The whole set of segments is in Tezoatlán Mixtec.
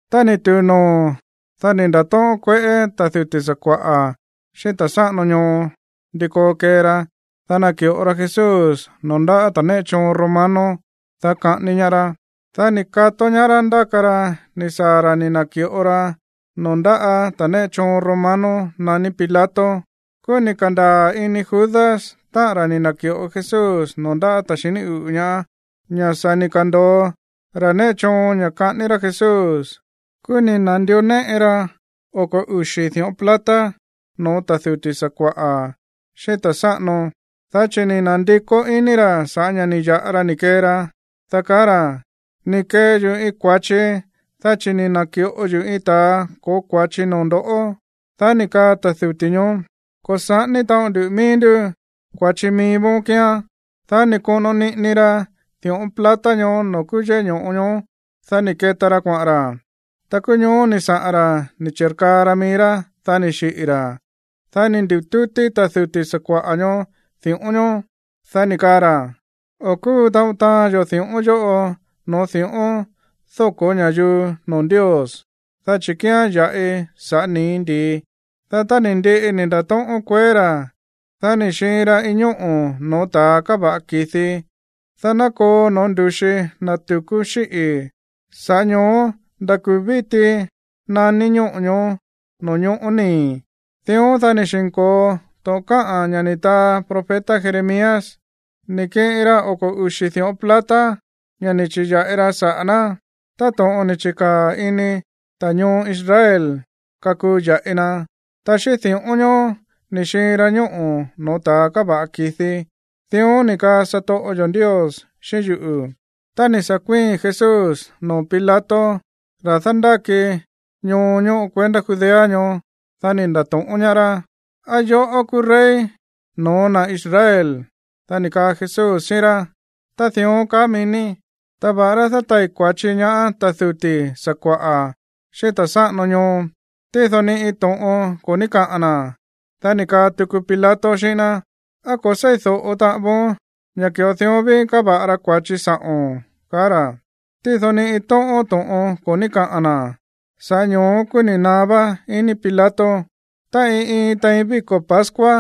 Tá ni̱ tu̱u noo̱, dá ni̱ nda̱tóꞌón kueꞌé ta̱ duti̱ sakua̱ꞌa̱, xíꞌín ta̱ sáꞌano ñoo ndi koo kee ra, dá naki̱ꞌo ra Jesús noo̱ ndáꞌa̱ ta̱ néꞌe choon romano, dá kaꞌání ñaá rá. Dá ni̱ kató ñaá rá ndáka ra ni̱ saa̱ ra̱ ni̱ na̱ki̱ꞌo ra noo̱ ndáꞌa̱ ta̱ néꞌe choon romano naní Pilato. Kúú ni̱ ka̱ndaa̱ ini Judas, táꞌa̱n ra̱ ni̱ na̱ki̱ꞌo Jesús noo̱ ndaꞌá ta̱a xiní uꞌu̱ ñaá, ña̱ sa̱ ni̱ ka̱ndo̱o ra̱ néꞌe choon ña̱ kaꞌání rá Jesús. Kúú ni̱ na̱ndió néꞌe ra oko̱ uxi̱ di̱ꞌón plata no̱ó ta̱ duti̱ sakua̱ꞌa̱ xíꞌín ta̱ sáꞌano, dá chi̱ ni̱ na̱ndikó iní ra̱ sa̱ꞌá ña̱ ni̱ ya̱ꞌa ra ni̱ kee ra, dá kaá ra̱: ―Ni̱ kee yuꞌu̱ iin kua̱chi, dá chi̱ ni̱ na̱ki̱ꞌo yuꞌu̱ iin ta̱a ko̱ó kua̱chi noo̱ ndo̱ꞌó. Dá ni̱ kaa ta̱ duti̱ ñoó: ―Ko̱ saꞌání taꞌon ndu mií ndú. Kua̱chi mií vóón kíán. Dá ni̱ koꞌono niꞌini ra di̱ꞌón plata ñoó noo̱ kúú yéꞌé ño̱ꞌo ñoó. Dá ni̱ keta ra kuaꞌa̱n ra. Ta kúú ñoó ni̱ saꞌa̱n ra̱ ni̱ chi̱rkaa ra mií rá, dá ni̱ xiꞌi̱ ra̱. Dá ni̱ ndi̱tútí ta̱ duti̱ sakua̱ꞌa̱ ñoó di̱ꞌón ñoó, dá ni̱ kaa ra̱: ―O̱ kúu taꞌon taán yo̱ di̱ꞌón yóꞌo no̱ó di̱ꞌón dóko̱ ña̱yuu noo̱ Ndios, dá chi̱ kíán ya̱ꞌi saꞌa̱ nii̱ ndi̱i. Dá tá ni̱ ndiꞌi ni̱ nda̱tóꞌón kueé ra̱, dá ni̱ xiin ra iin ñóꞌo̱ no̱ó ta̱ káva̱ꞌa ki̱di, dá ná koo no̱ó ndu̱xi na̱ tu̱kú xíꞌi̱. Sa̱ꞌá ño̱ó nda̱ kuu̱ víti naní ñóꞌo̱ ñoó, no̱ñóꞌo̱ nii̱. Dión, dá ni̱ xi̱nko̱o to̱ꞌon káꞌa̱n ña̱ ni̱ taa profeta Jeremías: “Ni̱ kiꞌin ra oko̱ uxi̱ di̱ꞌón plata, ña̱ ni̱ chi̱ya̱ꞌi ra saꞌa̱ ná táto̱ꞌon ni̱ chi̱kaa̱ ini ta̱ ñoo Israel kakuu ya̱ꞌi na, ta xíꞌín di̱ꞌón ñoó ni̱ xiin ra ñóꞌo̱ no̱ó ta̱a káva̱ꞌa ki̱di. Dión ni̱ kaa satoꞌo yo̱ Ndios xíꞌín yuꞌu̱.” Tá ni̱ sa̱ kuíi̱n Jesús noo̱ Pilato, ra̱ dándáki ñoo ñóꞌo kuendá Judea ñoó, dá ni̱ nda̱to̱ꞌón ñaá rá: ―¿Á yoꞌó kúú rey no̱ó na̱ Israel? Dá ni̱ kaa Jesús xíꞌín rá: ―Ta dión kaá mií ní. Ta va̱ꞌará dátai̱ kua̱chi ñaá ta̱ duti̱ sakua̱ꞌa̱, xíꞌín ta̱ sáꞌano ñoo, tído ni iin tóꞌón to̱ꞌon ko̱ ní kaꞌa̱n na̱. Dá ni̱ kaa tuku Pilato xíꞌín ná: ―¿Á ko̱ se̱ídóꞌo taꞌan voón ña̱ ki̱ꞌo dión ví káva̱ꞌa ra kua̱chi sa̱ꞌo̱n? ―ka̱á ra̱. Tído ni iin tóꞌón to̱ꞌon ko̱ ní kaꞌa̱n na̱. Sa̱ꞌá ño̱ó kúú ni̱ naá vá iní Pilato. Ta iin iin tein víko̱ pascua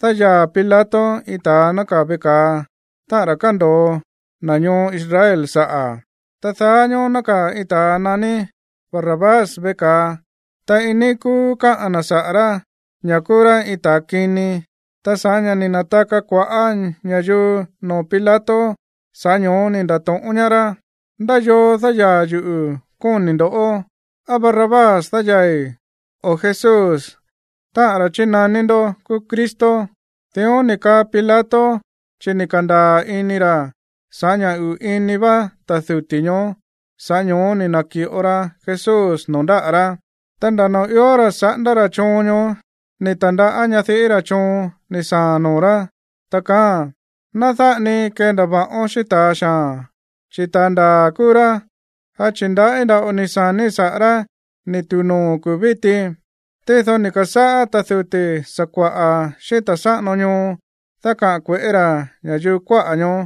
dáyaa̱ Pilato iin ta̱a nákaa̱ veꞌe ka̱a, táꞌa̱n ra̱ kándo̱o na̱ ñoo Israel saꞌa̱. Ta daá ñóó nákaa̱ iin ta̱a naní Barrabás veꞌe ka̱a, ta iin níí kúú káꞌa̱n na̱ saꞌa̱ rá ña̱ kúú rá iin ta̱ kini. Ta sa̱ꞌá ña̱ ni̱ na̱taka kua̱ꞌá ña̱yuu noo̱ Pilato, sa̱ꞌá ño̱ó ni̱ nda̱to̱ꞌón ñaá rá: ―¿Ndá yoo dáyaa̱ yuꞌu̱, kóni̱ ndo̱? ¿Á Barrabás dáyaa̱i̱, o Jesús, táꞌa̱n ra̱ chínaní ndó kúú Cristo? Dión ni̱ kaa Pilato, chi̱ ni̱ ka̱ndaa̱ ini ra̱ ña̱ sa̱ꞌá ña̱ uꞌu̱ iní vá ta̱ duti̱ ñoó, sa̱ꞌá ño̱ó ni̱ na̱ki̱ꞌo ra Jesús noo̱ ndáꞌa̱ rá. Ta nda̱ noo̱ ió ra̱ saꞌándá ra̱ choon ñoó, ni̱ ta̱ndaꞌá ñadiꞌí ra̱ choon ni̱ saa̱a̱n noo̱ rá, ta kaáa̱n: “Ná dáꞌa ni kendava̱ꞌón xíꞌín ta̱a xaa̱n, chi̱ ta̱a ndaa̱ kúú rá. Dá chi̱ ndaꞌí nda̱ꞌo ni̱ sa̱níi̱ saꞌa̱ rá ni̱ tu̱u noo̱ kuu̱ víti.” Tído ni̱ ka̱sáꞌá ta̱ duti̱ sakua̱ꞌa̱ xíꞌín ta̱ sáꞌano ñoo dákaꞌa̱n kue̱ꞌé ra̱ ña̱yuu kuáꞌa̱ ñoó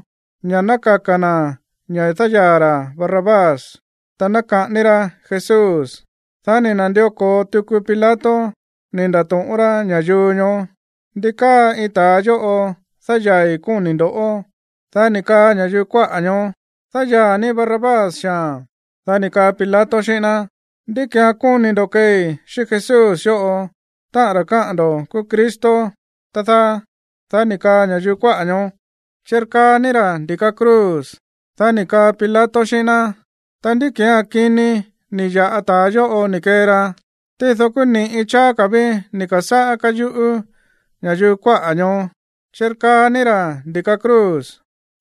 ña̱ ná kaka̱ na̱ ña̱ dáyaa̱ ra̱ Barrabás, ta ná kaꞌání rá Jesús. Dá ni̱ na̱ndió ko̱o tuku Pilato ni̱ nda̱to̱ꞌón rá ña̱yuu ñoó: ―¿Ndi káa iin ta̱a yóꞌo dáyaa̱i̱, kóni̱ ndo̱? Dá ni̱ kaa ña̱yuu kuáꞌa̱ ñoó: ―Dáyaa̱ ní Barrabás xaa̱n. Dá ni̱ kaa Pilato xíꞌín ná: ―¿Ndí ki̱án kóni̱ ndo̱ keei xíꞌín Jesús yóꞌo, táꞌa̱n ra̱ kaá ndo̱ kúú Cristo, tá dáá? Dá ni̱ kaa ña̱yuu kuáꞌa̱ ñoó: ―Chirkaa ní ra̱ ndi̱ka cruz. Dá ni̱ kaa Pilato xíꞌín ná: ―Ta, ¿ndí ki̱án kini ni̱ ya̱ꞌa ta̱a yóꞌo ni̱ kee ra? Tído kúú ni̱ꞌi cháá ka̱ ví ni̱ ka̱sáꞌá káyuꞌú ña̱yuu kuáꞌa̱ ñoó: ―¡Chirkaa ní ra̱ ndi̱ka cruz!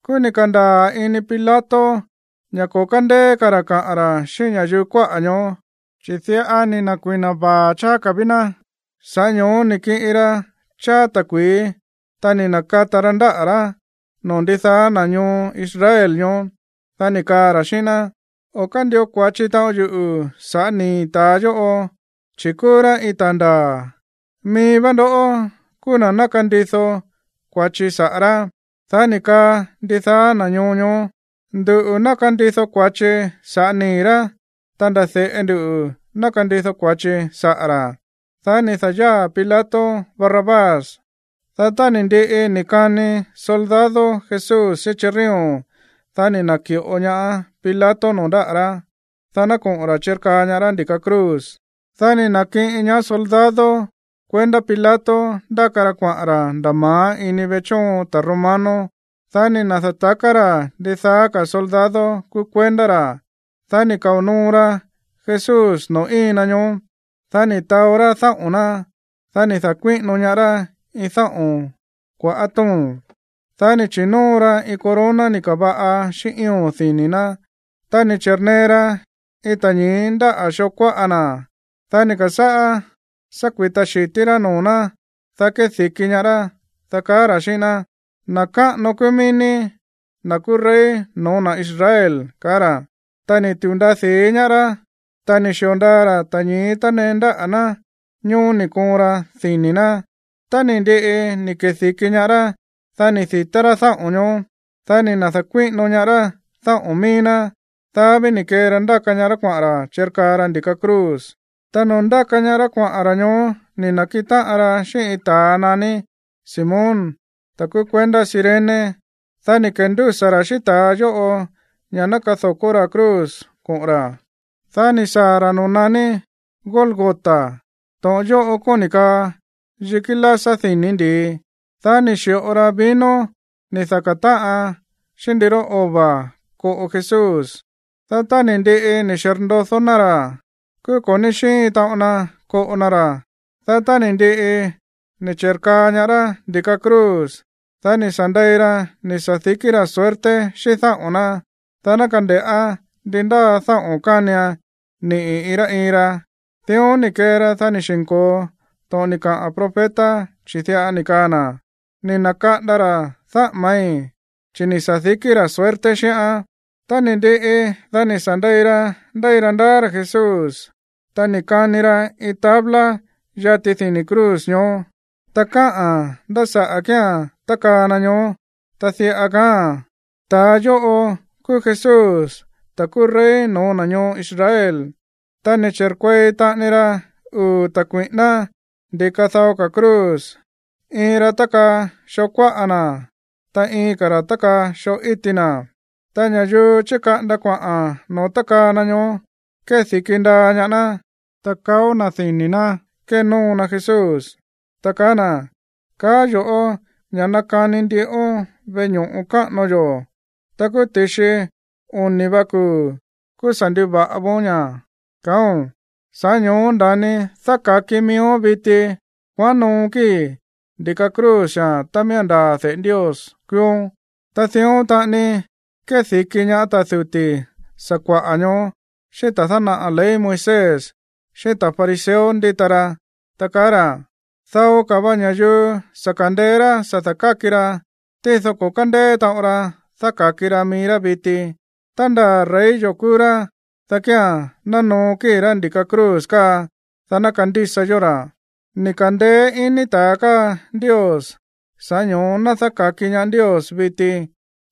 Kúú ni̱ ka̱ndaa̱ ini Pilato ña̱ ko̱ kándeé ka̱ ra̱ kaꞌa̱n ra̱ xíꞌín ña̱yuu kuáꞌa̱ ñoó, chi̱ diꞌa ni̱ na̱kui̱na vaa̱ cháá ka̱ ví ná. Sa̱ꞌá ño̱ó ni̱ kiꞌin ra cháá ta̱kui̱í, ta ni̱ na̱kata ra ndáꞌa̱ rá noo̱ ndidaá na̱ ñoo Israel ñoó, dá ni̱ kaa ra̱ xíꞌín ná: ―O̱ kándio kua̱chi taꞌon yuꞌu̱ sa̱ꞌá nii̱ ta̱a yóꞌo, chi̱ kúú rá iin ta̱a ndaa̱. Mií vá ndó kúú na̱ ná kandido kua̱chi saꞌa̱ rá. Dá ni̱ kaa ndidaá na̱ ñoo ñoó: ―Nduꞌu̱ ná kandido kua̱chi sa̱ꞌá nii̱ rá, ta nda̱ de̱ꞌe ndu ná kandido kua̱chi saꞌa̱ ra̱. Dá ni̱ da̱yáa̱ Pilato Barrabás. Dá tá ni̱ ndiꞌi ni̱ kani soldado Jesús xíꞌín chirrión, dá ni̱ na̱ki̱ꞌo ñaá Pilato noo̱ ndáꞌa̱ rá, dá ná koꞌo̱n ra̱ chirkaa ñaá rá ndi̱ka cruz. Dá ni̱ na̱kiꞌin ñaá soldado kuendá Pilato ndáka ra kuaꞌa̱n ra̱ nda̱ ma̱á ini veꞌe chóon ta̱ romano. Dá ni̱ na̱da̱taká ra̱ ndidaá ka̱ soldado kúú kuendá ra̱, dá ni̱ kao̱ noo ra Jesús noo̱ íin na ñoó. Dá ni̱ taó rá dáꞌo̱n ná. Dá ni̱ da̱kuíꞌino ñaá rá iin dáꞌo̱n kua̱ꞌá to̱ón. Dá ni̱ chi̱nóo ra iin corona ni̱ ka̱va̱ꞌa xíꞌín ío̱n dini̱ ná. Ta ni̱ chi̱rnee ra iin ta̱ñi̱í ndáꞌa̱ xoo kuáꞌa na̱. Dá ni̱ ka̱sáꞌá sá kui̱ta xi̱tí rá noo̱ ná, dá kedi̱ki ñaá rá, dá kaá ra̱ xíꞌín ná: ―Na̱ káꞌano kúú mií ní, na̱ kúú rey no̱ó na̱ Israel ―ka̱á ra̱. Ta ni̱ tu̱u ndaa di̱í ñaá rá, ta ni̱ xi̱o ndaa ra̱ ta̱ñi̱í néꞌe na ñoó ni̱ koon ra dini̱ ná. Tá ni̱ ndiꞌi ni̱ kedi̱ki ñaá rá, dá ni̱ di̱tá rá dáꞌo̱n ñoó. Dá ni̱ na̱da̱kuíꞌino ñaá rá dáꞌo̱n míí ná. Dá ví ni̱ kee ra ndáka ñaá rá kuaꞌa̱n ra̱ chirkaa ra ndi̱ka cruz. Ta noo̱ ndáka ñaá rá kuaꞌa̱n ra̱ ñoó, ni̱ na̱kiꞌin táꞌan ra xíꞌín iin ta̱a naní Simón, ta̱ kúú kuendá Cirene. Dá ni̱ kendúsa̱ ra̱ xíꞌín ta̱a yóꞌo ña̱ ná kado̱kó ra̱ cruz koꞌo̱n ra̱. Dá ni̱ saa̱ ra̱ noo̱ naní Gólgota. To̱ꞌon yóꞌo kóni̱ kaa yikí lásá dini̱ ndi̱i. Dá ni̱ xi̱ꞌo ra vino ni̱ daká táꞌan xíꞌín ndiró ova̱ koꞌo Jesús. Dá tá ni̱ ndiꞌi ni̱ xirndodó ná ra̱, kúú ko̱ ní xíin taꞌon na koꞌo na ra̱. Dá tá ni̱ ndiꞌi ni̱ chi̱rkaa ñaá rá ndi̱ka cruz, dá ni̱ sa̱ ndei ra ni̱ sa̱dikí ra̱ suerte xíꞌín dáꞌo̱n ná, dá ná kande̱ꞌá ndi ndáa dáꞌo̱n kánian niꞌi̱ iin rá iin ra. Dión ni̱ kee ra, dá ni̱ xi̱nko̱o to̱ꞌon ni̱ kaꞌa̱n profeta, chi̱ diꞌa ni̱ kaa na̱: “Ni̱ na̱kaꞌanda ra̱ dáꞌámáí, chi̱ ni̱ sa̱dikí ra̱ suerte xíꞌán.” Tá ni̱ ndiꞌi, dá ni̱ sa̱ ndei ra ndéi ra ndaá ra̱ Jesús. Ta ni̱ kani ra iin tabla yati dini̱ cruz ñoó, ta káꞌa̱n ndá saꞌa̱ kía̱n tákaa na ñoó. Ta diꞌa kaáa̱n: “Ta̱a yóꞌo kúú Jesús, ta̱ kúú rey no̱ó na̱ ñoo Israel.” Ta ni̱ chi̱rkuei taꞌani ra uu̱ ta̱ kui̱ꞌíná ndi̱ka dao ka̱ cruz. Iin ra tákaa xoo kuáꞌa na̱, ta iin ka̱ ra̱ tákaa xoo íti na̱. Ta ña̱yuu chíkaꞌanda kuaꞌa̱n no̱ó tákaa na ñoó kédi̱ki ndaa ñaá ná, ta kaó na̱ dini̱ ná kénóo na Jesús, ta kaá na̱: ―Kaá yo̱ꞌó ña̱ nakani ndiꞌón veꞌe ño̱ꞌo káꞌano yo̱, ta kúú ti̱xi oni̱ va kuu̱, kúú sa̱ nduva̱ꞌa voón ña̱, kaáo̱n. Sa̱ꞌá ño̱ó nda̱ni dáka̱ki miíón viti. Kuaꞌán noo kíi̱ ndi̱ka cruz xaa̱n tá miía̱n ndaa̱ de̱ꞌe Ndios kúúón. Ta dión taꞌani kédi̱ki ñaá ta̱ duti̱ sakua̱ꞌa̱ ñoó, xíꞌín ta̱ dánaꞌa̱ ley Moisés, xíꞌín ta̱ fariseo ndíta ra, ta kaá ra̱: ―Dao ka̱ va ña̱yuu sa̱ ka̱ndeé rá sa̱ da̱káki ra, tído ko̱ kándéé taꞌon ra dáka̱ki ra mií rá viti. Tá nda̱ rey yo̱ kúú rá, dá kía̱n ná noo kíi̱ rá ndi̱ka cruz káa, dá ná kandísa yó ra̱. Ni̱ ka̱ndeé iní ta̱ káa Ndios, sa̱ꞌá ño̱ó ná dáka̱ki ñaá Ndios viti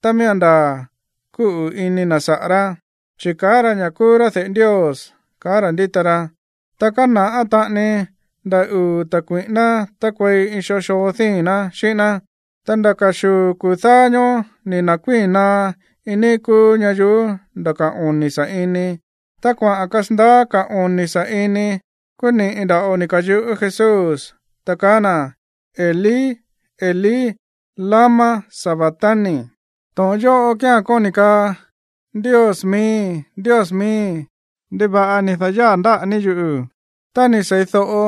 tá miía̱n ndaa̱ kúꞌu̱ ini na̱ saꞌa̱ rá, chi̱ kaá ra̱ ña̱ kúú rá de̱ꞌe Ndios ―ka̱á ra̱ ndíta ra. Ta kána̱ꞌá taꞌani nda̱ uu̱ ta̱ kui̱ꞌíná tákuei iin iin xoo díi̱n ná xíꞌín ná. Ta nda̱ ka̱xuu̱ kuu̱ dáá ñóó ni̱ na̱kuíi̱n naá iin níí kúú ñayuú nda̱ ka̱ oni̱ sa̱ꞌini. Tá kuaꞌa̱n kasandaá ka̱ oni̱ sa̱ꞌini, kúú ni̱ꞌi nda̱ꞌo ni̱ ka̱yuꞌú Jesús, ta kaá na̱: ―Elí, Elí, ¿lama sabactani? ―to̱ꞌon yóꞌo kía̱n kóni̱ kaa: Ndios miíi̱, Ndios miíi̱, ¿ndiva̱ꞌa ni̱ da̱yáa̱ ndáꞌa̱ ní yuꞌu̱? Tá ni̱ sei̱do̱ꞌo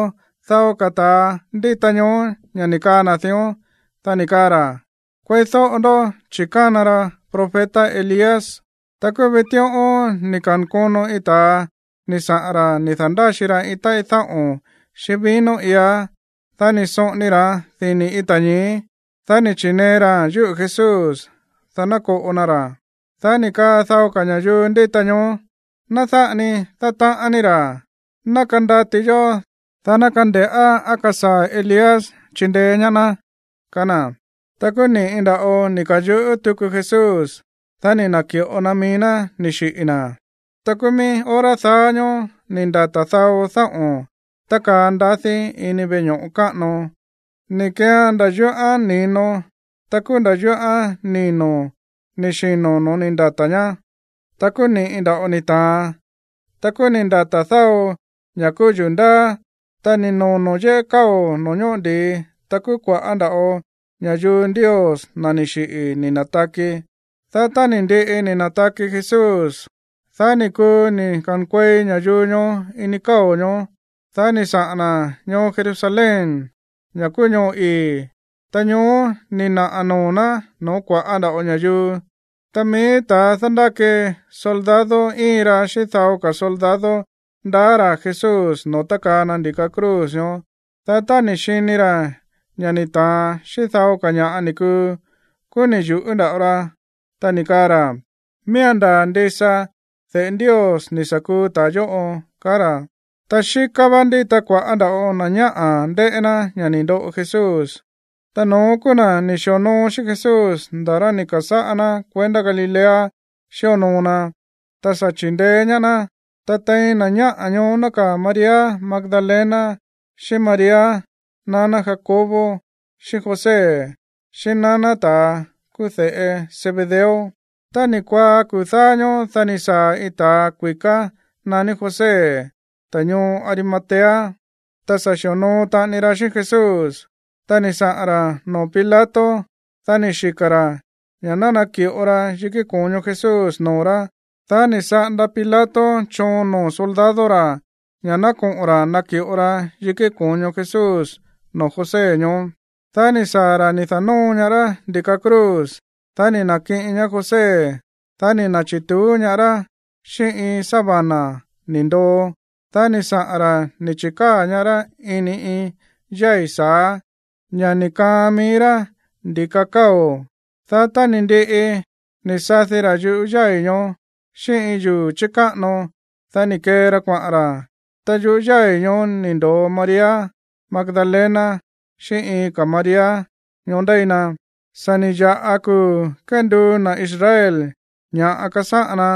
dao ka̱ ta̱a ndíta ñoó ña̱ ni̱ kaa na̱ dión, dá ni̱ kaa ra̱: ―Kueídóꞌo ndó, chi̱ kána ra profeta Elías. Ta kúú vitíꞌón ni̱ ka̱nkono iin ta̱a ni̱ saꞌa̱n ra̱ ni̱ da̱ndáxi ra iin táꞌí dáꞌo̱n xíꞌín vino iá. Dá ni̱ soꞌoni ra̱án dini̱ iin ta̱ñi̱í. Dá ni̱ chi̱nee raa̱n yúꞌu̱ Jesús, dá ná koꞌo na ra̱. Dá ni̱ kaa dao ka̱ ña̱yuu ndíta ñoó: ―Ná dáꞌa ni kee ní díon. Ná kandati yó, ta ná kande̱ꞌá á kasaa̱ Elías chindeé ñaá ná ―kaá na̱. Ta kúú ni̱ꞌi nda̱ꞌo ni̱ ka̱yuꞌú tuku Jesús, dá ni̱ na̱ki̱ꞌo na mií ná ni̱ xiꞌi̱ na̱. Ta kúú mií hora daá ñóó ni̱ ndata̱ dao dáꞌo̱n tákaa ndadí ini veꞌe ño̱ꞌo káꞌano. Ni̱ keean nda̱ yúꞌán ni̱no, ta kúú nda̱ yúꞌán nino̱ ni̱ xino̱ no̱ó ni̱ ndata̱ ñá. Ta kúú ni̱ꞌi nda̱ꞌo ni ta̱an, ta kúú ni̱ ndata̱ dao ña̱ kúú yuu̱ ndáá, ta ni̱ nono̱ yéꞌé káo̱ noo̱ ñóꞌo ndi̱i, ta kúú kua̱ꞌá nda̱ꞌo ña̱yuu Ndios, na̱ ni̱ xiꞌi̱, ni̱ na̱taki. Dá tá ni̱ ndiꞌi ni̱ na̱taki Jesús, dá ni̱ kuu ni̱ ka̱nkuei ña̱yuu ñoó ini káo̱ ñoó, dá ni̱ saꞌa̱n na̱ ñoo Jerusalén, ña̱ kúú ñoo ii̱, ta ñoó ni̱ naꞌa̱ noo̱ ná no̱ó kua̱ꞌá nda̱ꞌo ña̱yuu. Ta mií ta̱ dándáki soldado íin ra xíꞌín dao ka̱ soldado ndaá ra̱ Jesús noo̱ tákaa na ndi̱ka cruz ñoó. Dá tá ni̱ xini ra̱ ña̱ ni̱ ta̱an xíꞌín dao ka̱ ña̱ꞌa ni̱ kuu, kúú ni̱ yu̱ꞌú nda̱ꞌo ra, ta ni̱ kaa ra̱: ―Miía̱n ndaa̱ ndisa de̱ꞌe Ndios ni̱ sa̱ kuu ta̱a yóꞌo ―kaá ra̱. Ta xíká vá ndíta kua̱ꞌá nda̱ꞌo na̱ ñáꞌa̱ ndéꞌé ná ña̱ ni̱ ndoꞌo Jesús. Ta no̱ón kúú na̱ ni̱ xi̱onoo xíꞌín Jesús nda̱ rá ni̱ ka̱sáꞌá ná kuendá Galilea xíonoo na, ta sa̱ chi̱ndeé ñaá ná. Ta tein na̱ ñáꞌa̱ ñoó nákaa̱ María Magdalena, xíꞌín María, naná Jacobo xíꞌín José, xíꞌín naná ta̱a kúú de̱ꞌe Zebedeo. Tá ni̱ kuaá kuu̱ dáá ñóó, dá ni̱ saa̱ iin ta̱a kui̱ká naní José, ta̱ ñoo Arimatea, ta sa̱ xi̱onoo taꞌani ra xíꞌín Jesús. Ta ni̱ saꞌa̱n ra̱ noo̱ nákaa̱ Pilato, dá ni̱ xika̱ ra̱ ña̱ ná naki̱ꞌo ra yikí ko̱ño Jesús noo̱ rá. Dá ni̱ saꞌanda Pilato choon noo̱ soldado ra̱ ña̱ ná koꞌo̱n ra̱ naki̱ꞌo ra yikí ko̱ño Jesús noo̱ José ñoó. Dá ni̱ saa̱ ra̱ ni̱ da̱nóo ñaá rá ndi̱ka cruz. Dá ni̱ na̱kiꞌin ñaá José, dá ni̱ na̱chi̱tuú ñaá rá xíꞌín iin sábana ni̱ ndoo. Dá ni̱ saꞌa̱n ra̱ ni̱ chi̱káa̱ ñaá rá ini iin yái̱ sa̱á, ña̱ ni̱ kaan mií rá ndi̱ka káo̱. Dá tá ni̱ ndiꞌi ni̱ sadi ra̱ yuꞌú yái̱ ñoó xíꞌín iin yuu̱ chi̱káꞌano, dá ni̱ kee ra kuaꞌa̱n ra̱. Ta yuꞌú yái̱ ñoó ni̱ ndo̱o María Magdalena xíꞌín iin ka̱ María ñoó ndéi na. Sa̱ ni̱ ya̱ꞌa kuu̱ kénduu na̱ Israel ña̱ꞌa kasáꞌan na.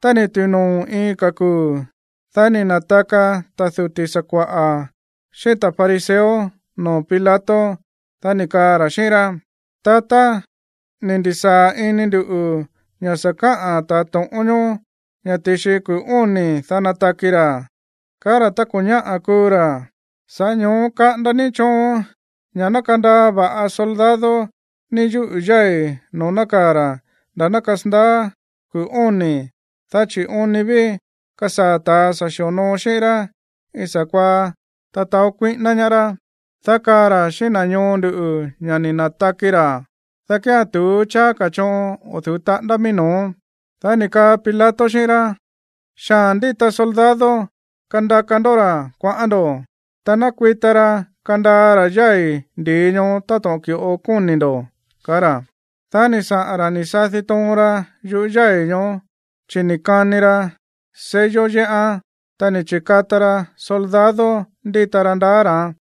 Tá ni̱ tu̱u noo̱ iin ka̱ kuu̱, dá ni̱ na̱taka ta̱ duti̱ sakua̱ꞌa̱ xíꞌín ta̱ fariseo noo̱ Pilato, dá ni̱ kaa ra̱ xíꞌín rá: ―Tatá, ni̱ ndi̱sáa̱ ini ndu̱ ña̱ sa̱ káꞌa̱n ta̱ to̱ꞌón ñoó ña̱ ti̱xi kuu̱ óni̱, dá nataki ra̱, kaá ra̱ tá ko̱ ñáꞌa̱ kuu ra̱. Sa̱ꞌá ño̱ó kaꞌanda ní choon ña̱ ná kandaa va̱ꞌa soldado ní yuꞌú yái̱ noo̱ nákaa̱ ra̱ nda̱ ná kasandaá kuu̱ óni̱. Dá chi̱ oon ni ví kasaa̱ ta̱ sa̱ xi̱onoo xíꞌín rá iin sa̱kuaá nataó kuíꞌíná ñaá rá, dá kaa ra̱ xíꞌín na̱ ñoo ndu̱ ña̱ ni̱ na̱taki ra̱, dá kía̱n tu̱ú cháá ka̱ choon o̱ du̱ú taꞌándá mií no̱ó. Dá ni̱ kaa Pilato xíꞌín rá: ―Xaa̱n ndíta soldado. Kandaka ndó ra̱ kuaꞌán ndo̱, ta nakui̱ta ra kandaa ra̱ yái̱ ndi̱i ñoó táto̱ꞌon ki̱ꞌo kóni̱ ndo̱ ―kaá ra̱. Dá ni̱ saꞌa̱n ra̱ ni̱ sadi toon ra yuꞌú yái̱ ñoó, chi̱ ni̱ kani ra sello yéꞌán, ta ni̱ chi̱kata ra soldado ndíta ra ndaá ra̱án.